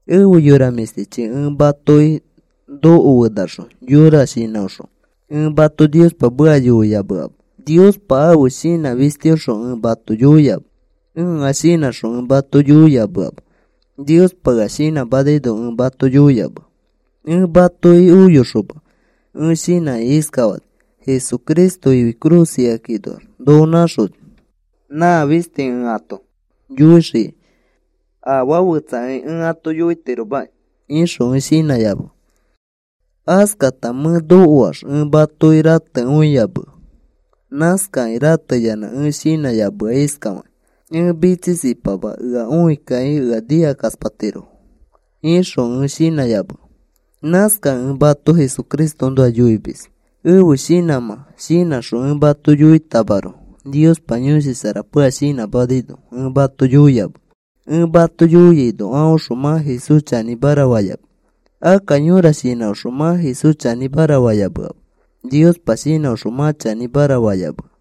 Efe yora mĩshtichi, ẽ matoki nokofenaxõ yõra shinãõxõ ẽ mato Niospa meka yoiyameama. Niospa ãfe shinã fistiõxõ ẽ mato yoiyamea. Ẽa shinãxõ ẽ mato yoiyameama. Niospa ea shinãmanaino ẽ mato yoiyamea. Ẽ matoki oyoxoma ẽ shinãkĩ iskafani: “Jesucristo ifi cruz ikakinoax noko nãxoni, nã fisti ẽ ato yoixikai. Afaa fetsa ẽ ato yoitiromaki,” ixõ ẽ shinãyamea. Askata mẽ nokoax ẽ matoki ratekõiyamea. Nãskakĩ rateyanã ẽ shinãyamea iskafakĩ: “Ẽ mitsisipama ea õikakĩ ea nikakaspatirofo,” ixõ ẽ shinãyamea. Nãskakẽ ẽ mato Jesucristoõnoa yoimis ẽfe shinãmã shinãxõ ẽ mato yoitamaroko Niospa Yõshi Sharapa ea shinãmanaino ẽ mato yoiyamea. Ẽ mato yoiaino aõxõ mã Jesús chanĩmara fayamea. Akka yõra shinãõxõ mã Jesús chanĩmara fayameama. Niospa shinãõxõ mã chanĩmara fayamea.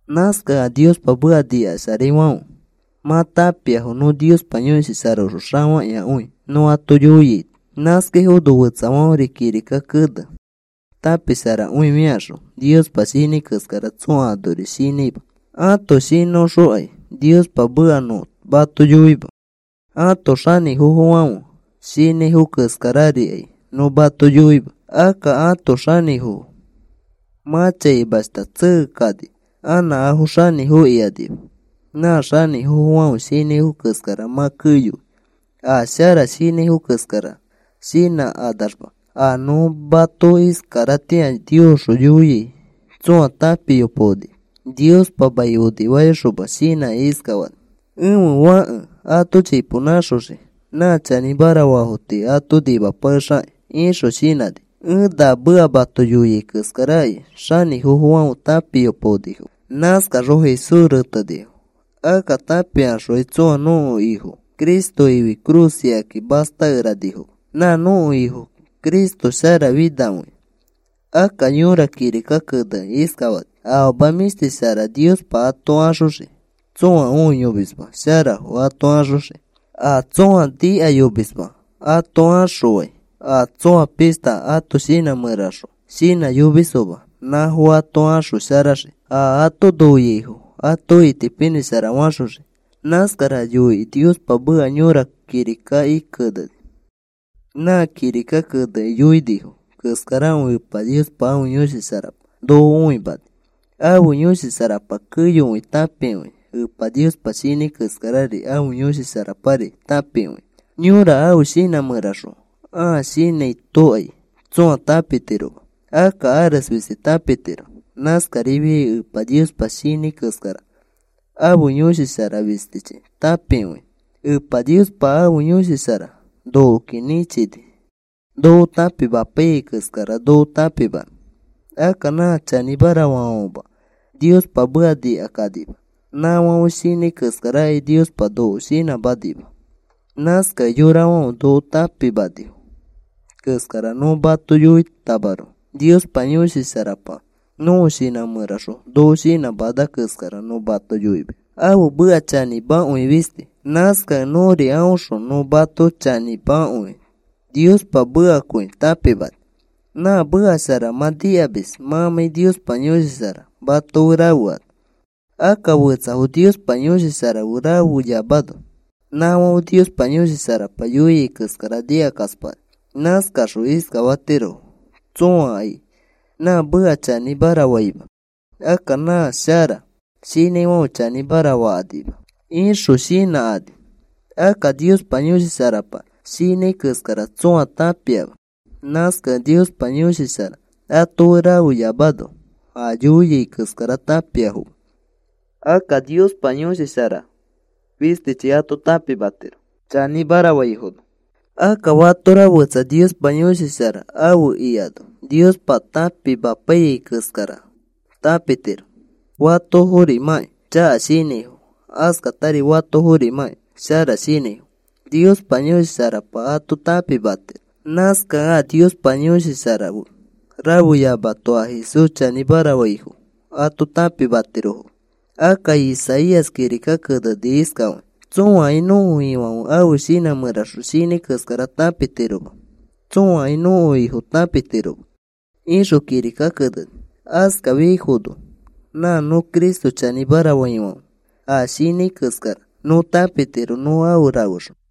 Nãskakẽ a Niospa meka nikasharaifãfe mã tãpiafo nõ Niospa Yõshi Sharaõxõ xafakĩakõi nõ ato yoiaito. Nãskaifono fetsafãferi kirika kene tãpisharakõifikaxõ Niospa shinãi keskara tsõa anori shinãima. Ãto shinãõxõkai Niospa meka nõ mato yoima. Ãto xanĩfofofãfe shinãifo keskararikai nõ mato yoima. Akka ãto xanĩfofo mã chaimashta tsekekani. Anã afo xanĩfo ikanima. Nã xanĩfofofãfe shinãifo keskara mã keyoi. A shara shinãifo keskara shinãkanaxma. A nõ mato iskaratĩa Niosxõ yoia tsõa tãpiyopaonima. Niospa mai onifayoxoma shinãkĩ iskafani: “Ẽfe Fãke ato chipo nãxoxii nã chanĩmara faafo tii ato nimapakexixakĩ,” ixõ shinãni. Ẽ na meka mato yoiai keskarakai xanĩfofofãfe tãpiyopaonifoma. Nãskaxõ Jesús retenifo. Akka tãpikaxokai tsõa nõko Ifo Cristo ifi cruz ikaki mastakeranifoma. Nã nõko Ifo Cristo sharafinakõia. Akka yõra kirika kenekĩ iskafani: Afama mĩshti shara Niospa ato axoxii. Tsõa õiyomisma sharafo ato axoxii. A tsõa nikayomisma ato axõfãi a tsoa pishta ãto shinã mẽraxõ shinãyomisfoma nãfo ato axosharaxii. A ato noiaifo ato itipinĩshara faxoxii, nãskara yoikĩ Niospa meka yõra kirikaki keneni. Nã kirika kenekĩ yoinifo keskarakõi Epa Niospa ãfe Yõshi Sharapa noko õimani. Ãfe Yõshi Sharapa keyokõi tãpikõia. Epa Niospa shinãi keskarari ãfe Yõshi Sharapari tãpikõia. Yõra ãfe shinã mẽraxõ ãa shinãitokai tsõa tãpitiroma. Akka ares fisti tãpitiro. Nãskarifiai Epa Niospa shinãi keskara ãfe Yõshi Shara fistichi tãpikõia. Epa Niospa ãfe Yõshi Shara nokoki nĩchini noko tãpimapaiyai keskara noko tãpimanõ. Akka nã chanĩmara faafãfema Niospa meka nikakanima. Nãfãfe shinãi keskarakai Niospa noko shinãmanima. Nãskakẽ yorafãfe noko tãpimanifo keskara nõ mato yoitamaroko Niospa Yõshi Sharapa nõko shinã mẽraxõ noko shinãmana keskara nõ mato yoimis. Ãfe meka chanĩmakõi fisti. Nãskakẽ nõri aõxõ nõ mato chanĩmakõi Niospa mekakõi tãpimani. Nã meka shara mã nikamis mãmãi Niospa Yõshi Shara mato fe rafeano. Akka fetsafo Niospa Yõshi Shara fe rafeyamano nãfãfe Niospa Yõshi Sharapa yoiai keskara nikakaspakani. Nãskaxõ iskafatirofo: “Tsõakai nã meka chanĩmara faima. Akka nã shara shinãifãfe chanĩmara fakanima,” ixõ shinãkani. Akka Niospa Yõshi Sharapa shinãi keskara tsõa tãpiama. Nãskakẽ Niospa Yõshi Shara ato fe rafeyamano a yoiai keskara tãpiafoma. Akka Niospa Yõshi Shara fistichi ato tãpimatiro chanĩmara faifono. Akka fatora fetsa Niospa Yõshi Shara afe ikano Niospa tãpimapaiyai keskara tãpitiro. Fatoforimãkĩ chaka shinãifo, askatari fatoforimãkĩ shara shinãifo Niospa Yõshi Sharapa ato tãpimatiro. Nãskakẽ a Niospa Yõshi Shara fe rafeyamato a Jesús chanĩmara faifo ato tãpitirofoma. Akka Isaías kirika keneni iskafakĩ: Tsõakai nõko Ifãfe ãfe shinã mẽraxõ shinãi keskara tãpitiroma. Tsõakai nõko Ifo tãpimatiroma, ixõ kirika keneni. Askafiaifono nã nõ Cristo chanĩmara faifãfe a shinãi keskara nõ tãpitiro nõ afe rafexõ.